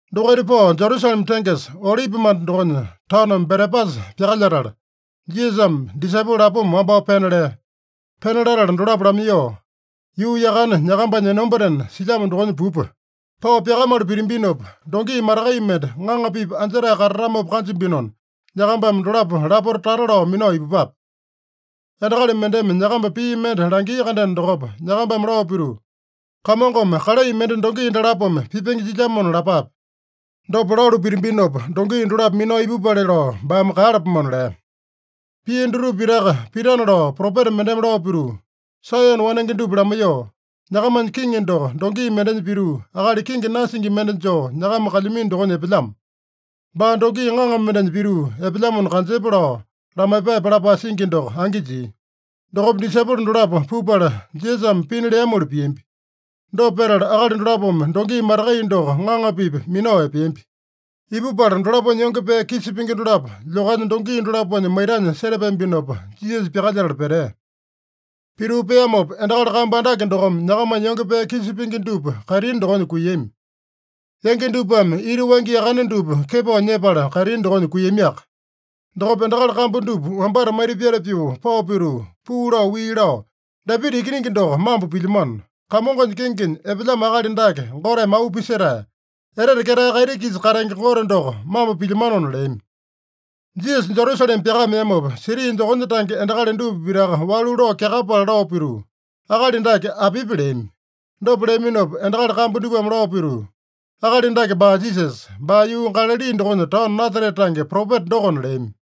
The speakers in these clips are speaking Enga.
Dokaita pao Jerusalema tengesa, Olipimanda dokonya taono Betepasa pyakalyetala, Jisasame disaipolo lapoma wambao pena lea. Pena latala dolapo lamaiyoo, “Yuu yakane nyakambanya enombatena silyamo dokonya pupa. Pao pyakamalu pitambinopa, dongi matakai mende ŋaŋa-pipa anjetae katatamopa kanjambinona, nyakambame dolapo lapota tata lao minao ipupape. Endakali mendeme nyakamba pii mende langia-kandeno dokopa, nyakambame lao pituu, ‘Kamongome kalai mende dongi dalapome pipenge jilyamona’ lapape. Dopa lalu pitambinopa, dongi dolapo minao ipupale lao baame kaeyalapomona” lea. Pia dutupa pitaka pitana lao propeta mendeme lao pituu, “Saeyone wanenge dupa lamaiyoo, ‘Nyakamanya kiŋi doko dongi mendenya pituu, akali kenge nasingi mende joo nyakama kalyamino dokonya epelyamo. Baa dongi ŋaŋa mendenya pituu epelyamona kanjepa’ lao lamaiyepape” lapae singi doko angi jia. Dokopa disaipolo dolapo pupala Jisasame pina leamoli piambi. Dopa petala, akali dolapome dongi matakai doko ŋaŋa-pipa minao epeambi. Ipupala dolaponya yonge pee kisa pingi dolapo lyokanya dongi dolaponya maitanya setapeambinopa, Jisasa pyakalyetala petea. Pituu peamopa, endakali kambu andake dokome nyakamanya yonge pee kisa pingi dupa kaitini dokonya kuiyami. Yangi dupame ita wangya yakane dupa kepao nyepala kaitini dokonya kuiyamiaka. Dokopa endakali kambu dupa wambata maita pyata pyoo pao pituu, puu lao wii lao, “Dapita Ikiningi doko mambo pilyamano. Kamongonya kengenya epelyamo akali dake Goteme auu pisetae! Etete ketae kaiti-kisa katenge Gote doko mambo pilyamanona” leami. Jisasa Jerusalema pyakameamopa, siti dokonya tange endakali dupa pitaka walu lao kyakapala lao pituu, “Akali dake apipi?” leami. Dopa leaminopa endakali kambu dupame lao pituu, “Akali dake baa Jisasa. Baa yuu Galali dokonya taono Nasarete tange propeta dokona” leami.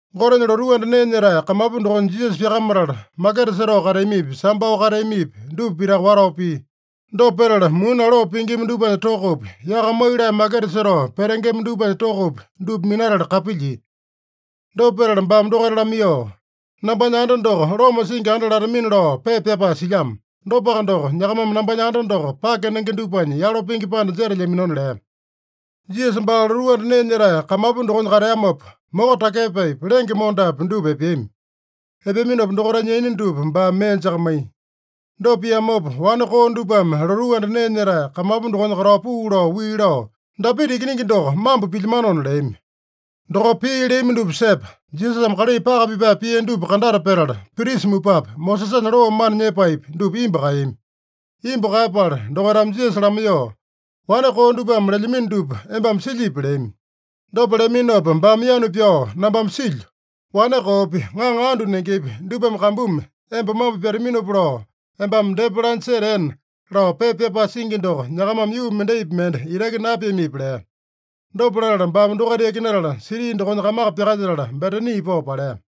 Gotenya lotuu anda nee nyetae kamapu dokonya Jisasa pyakamatala, maketa setao kateamipi, sambao kateamipi, dupa pitaka watao pia. Dopa petala, muni aloo pingima dupanya tokopi, yaka maiyolee maketa setao petengema dupanya tokopi, dupa minatala kapilyia. Dopa petala baame dokaita lamaiyoo, “ ‘Nambanya anda doko loma singi anda latamina’ lao pepa pyapae silyamo. Dopaka doko, nyakamame nambanya anda doko pake nenge dupanya yalo pingi panda jetelyaminona” lea. Jisasa baa lotuu anda nee nyetae kamapu dokonya kateamopa, moko takyepaepi, lenge mondapi dupa epeami. Epeaminopa dokaitanya yaina dupa baame mee jakamaiya. Dopa piamopa, wane koo dupame lotuu anda nee nyetae kamapu dokonya katao puu lao wii lao, “Dapita Ikiningi doko mambo pilyamanona” leami. Dokopa pii leami dupa sepa, Jisasame kalai paka pipae pia dupa kandata petala, prisa mupapi, Mosesanya loo mana nyepaepi, dupa imbu kaeyami. Imbu kaeyapala dokaitame Jisasa lamaiyoo, “Wane koo dupame lelyamino dupa embame silyipi?” leami. Dopa leaminopa baame yanu pyao, “Nambame silyo. ‘Wane koopi, ŋaŋa andu nengepi, dupame kambumi emba mambo pyataminopa lao embame depa lanya seteena’ lao pepa pyapae singi doko nyakamame yuu mendaipi mende itaki napiamipi?” lea. Dopa latala baame dokaita yakinatala, siti dokonya kamaka pyakalyetala, Betani pao palea.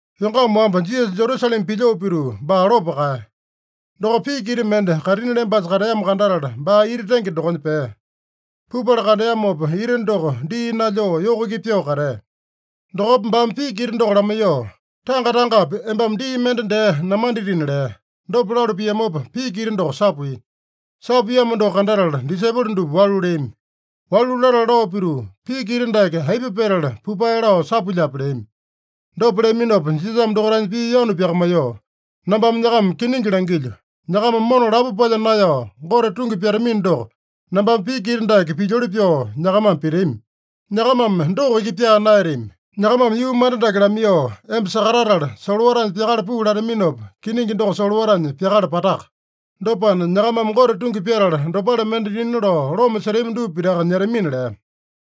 Yongama wamba, Jisasa Jerusalema pilyoo pituu, baa lopo kaeya. Dokopa piki ita mende kaitini lembasa kateamo kandatala, baa ita tenge dokonya pea. Pupala kandeamopa, ita doko dii nalyoo yoko iki pyoo katea. Dokopa baame piki ita doko lamaiyoo, “Tanga-tangapi embame dii mende dee namanditina” lea. Dopa lalu piamopa piki ita doko sapuiya. Sapuiyamo doko kandatala, disaipolo dupa walu leami. Walu latala lao pituu, “Piki ita dake aipa petala pupae lao sapuilyape?” leami. Dopa leaminopa Jisasame dokaitanya pii yanu pyakamaiyoo, “Nambame nyakama kiningi langilyo: Nyakama mona lapo palya naeyao Gote tungi pyatamino doko, nambame piki ita dake pilyoli pyoo nyakamame pitami. Nyakamame doko iki pyaa naeyatami. Nyakamame yuu manda dake lamaiyoo, ‘Emba sakatatala, solowatanya pyakala puu’ lataminopa, kiningi doko solowatanya pyakala pataka. Dopana, nyakamame Gote tungi pyatala, dopale mende dina lao loma setami dupa pitaka nyetamina” lea.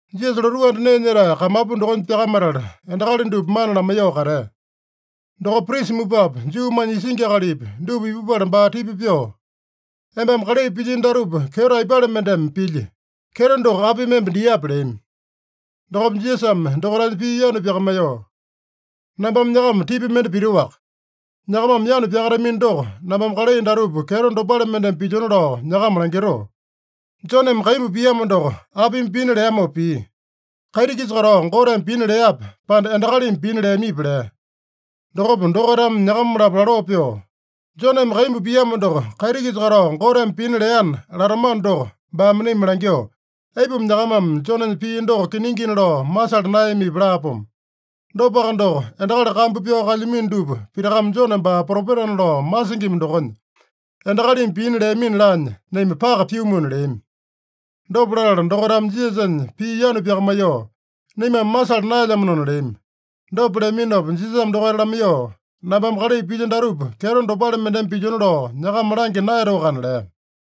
Jisasa lotuu anda nee nyetae kamapu dokonya pyakamatala, endakali dupa mana lamaiyoo katea. Dokopa prisa mupapi, Juumanya isingi akalipi, dupa ipupala baa tipa pyoo, “Embame kalai pilyino datupa, kyeto aipale mendeme pilyi? Kyeto doko apimi emba diape?” leami. Dokopa Jisasame dokaitanya pii yanu pyakamaiyoo, “Nambame nyakama tipa mende pitoaka. Nyakamame yanu pyakatamino doko, nambame kalai datupa kyeto dopale mendeme pilyona lao nyakama langitoo: Joneme kaimbu piamo doko, apimi pina leamopa pia? Kaiti-kisa katao Goteme pina leape, pande endakalimi pina leamipi?” lea. Dokopa dokaitame nyakama-lapo laloo pyoo, “ ‘Joneme kaimbu piamo doko, kaiti-kisa katao Goteme pina leana’ latamano doko, baame naima langyoo, ‘Aipuma nyakamame Jonenya pii doko kiningina lao masala naeyamipi?’ laapomo. Dopaka doko, endakali kambu pyao kalyamino dupa pitakame Jone baa propetana lao masingima dokonya, ‘Endakalimi pina leamina’ laanya naima paka pyumuna” leami. Dopa latala dokaitame Jisasanya pii yanu pyakamaiyoo, “Naimame masala naelyamanona” leami. Dopa leaminopa Jisasame dokaita lamaiyoo, “Nambame kalai pilyo datupa kyeto dopale mendeme pilyona lao nyakama langya naeyatoakana” lea.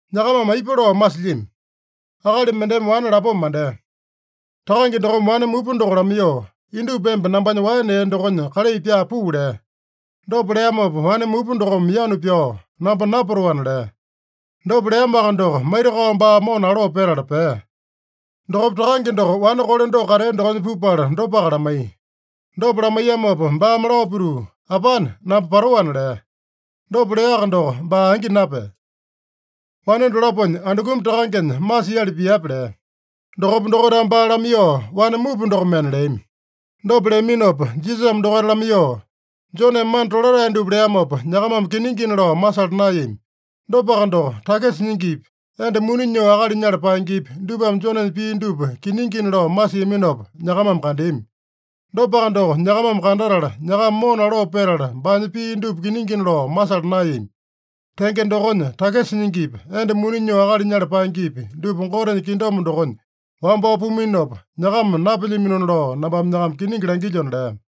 “Nyakamame aipa lao masilyami? Akali mendeme wane lapoma mandea. Takange dokome wane mupa doko lamaiyoo, ‘Indupa emba nambanya waene ee dokonya kalai pyaa puu’ lea. Dopa leamopa wane mupa dokome yanu pyao, ‘Namba napatoana’ lea. Dopa leamoaka doko, maitakao baa mona aloo petala pea. Dokopa takange doko wane kole doko katea dokonya pupala dopaka lamaiya. Dopa lamaiyamopa baame lao pituu, ‘Apane, namba patoana’ lea. Dopa leaka doko, baa angi napea. Wane dolaponya andukumi takangenya masiali piape?” lea. Dokopa dokaitame baa lamaiyoo, “Wane mupa dokomena” leami. Dopa leaminopa Jisasame dokaita lamaiyoo, “Joneme mana tolatae dupa leamopa, nyakamame kiningina lao masala naeyami. Dopaka doko, takisa nyingipi, enda muni nyoo akali nyala paengepi, dupame Jonenya pii dupa kiningina lao masiaminopa, nyakamame kandeami. Dopaka doko nyakamame kandatala, nyakama mona aloo petala baanya pii dupa kiningina lao masala naeyami. Tenge dokonya, takisa nyingipi, enda muni nyoo akali nyala paengepi, dupa Gotenya kingdom dokonya wambao puminopa, nyakama napelyaminona lao nambame nyakama kiningi langilyona” lea.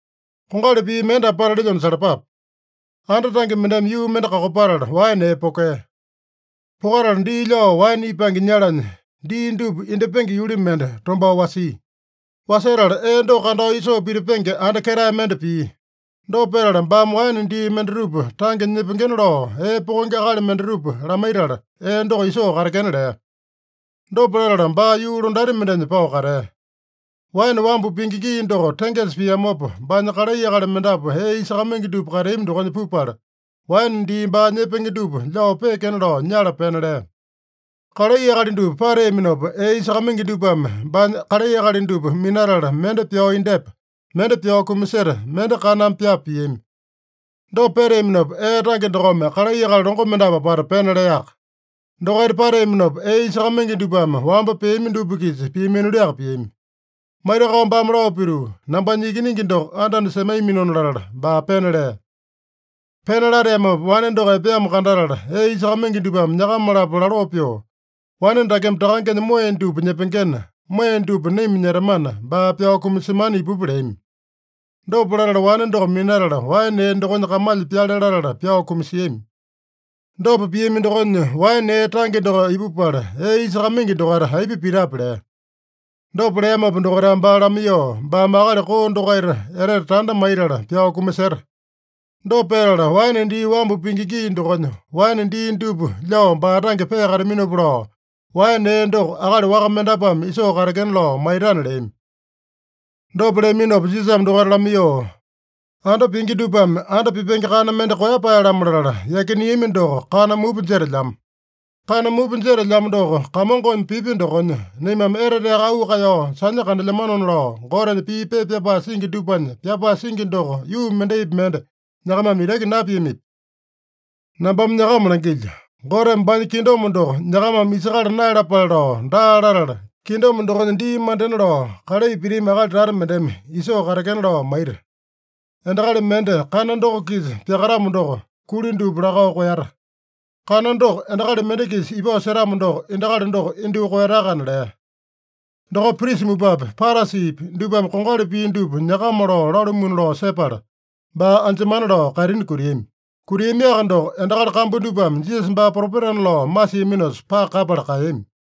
“Kongali pii mende apata lelyona salapape: Anda tange mendeme yuu mende kakopatala, waene ee pokea. Pokatala dii lyao waene ipange nyalanya dii dupa indyepenge yuli mende tombao wasia. Wasetala ee doko kandao isoo pitipenge anda ketae mende pia. Dopa petala baame waene dii mendatupa tange nyepengena lao, ee pokenge akali mendatupa lamaitala, ee doko isoo katekena lea. Dopa latala baa yuu londati mendenya pao katea. Waene wambu pingi gii doko tengesa piamopa, baanya kalai akali mendapu ee isakamaingi dupa kateami dokonya pupala, waene dii baa nyepenge dupa lyao peekena lao nyala pena lea. Kalai akali dupa pateaminopa, ee isakamaingi dupame baanya kalai akali dupa minatala, mende pyao indyepa, mende pyao kumaseta, mende kaname pyapa piami. Dopa peteaminopa, ee tange dokome kalai akali longo mendapu apata pena leaka. Dokaita pateaminopa, ee isakamaingi dupame wamba peami dupa-kisa piamiliaka piami. Maitakao baame lao pituu, ‘Nambanya ikiningi doko anda-anda semaiyaminona’ latala, baa pena lea. Pena lateamopa wane doko epeamo kandatala, ee isakamaingi dupame nyakama-lapo laloo pyoo, ‘Wane dakeme takangenya moeya dupa nyepengena, moeya dupa naima nyetamana, baa pyao kumasemana ipupa’ leami. Dopa latala, wane doko minatala waene ee dokonya kamalya pyale latala pyao kumasiami. Dopa piami dokonya, waene ee tange doko ipupala, ee isakamaingi dokaita aipa pitape?” lea. Dopa leamopa dokaitame baa lamaiyoo, “Baame akali koo dokaita etete tanda maitala pyao kumaseta. Dopa petala, waene dii wambu pingi gii dokonya waene dii dupa lyao baa tange peakataminopa lao, waene ee doko akali waka mendapuame isoo katekena lao maitana” leami. Dopa leaminopa Jisasame dokaita lamaiyoo, “ ‘Anda pingi dupame anda pipenge kana mende koeyapae-lamo latala yakineami doko kana mupa jetelyamo. Kana mupa jetelyamo doko Kamongome pipya dokonya, naimame eteteaka auu kaeyao sanya kandelyamanona’ lao Gotenya pii pepa pyapae singi dupanya pyapae singi doko yuu mendaipi mende nyakamame itaki napiamipi? Nambame nyakama langilyo: Goteme baanya kingdom doko nyakamame isakala naeyalapale lao daa latala, kingdom dokonya dii mandena lao kalai pitami akali tata mendeme isoo katekena lao maita. Endakali mende kana doko-kisa pyakatamo doko, kuli dupa lakao koeyata. Kana doko endakali mende-kisa ipao setamo doko, endakali doko indyoo koeyatakana” lea. Dokopa prisa mupapi, Parasipi dupame kongali pii dupa nyakama lao lalumuna lao sepala, baa anjemana lao kaitini kutiami. Kutiamiaka doko, endakali kambu dupame Jisasa baa propetana lao masiaminosa, paka kaeyapala kaeyami.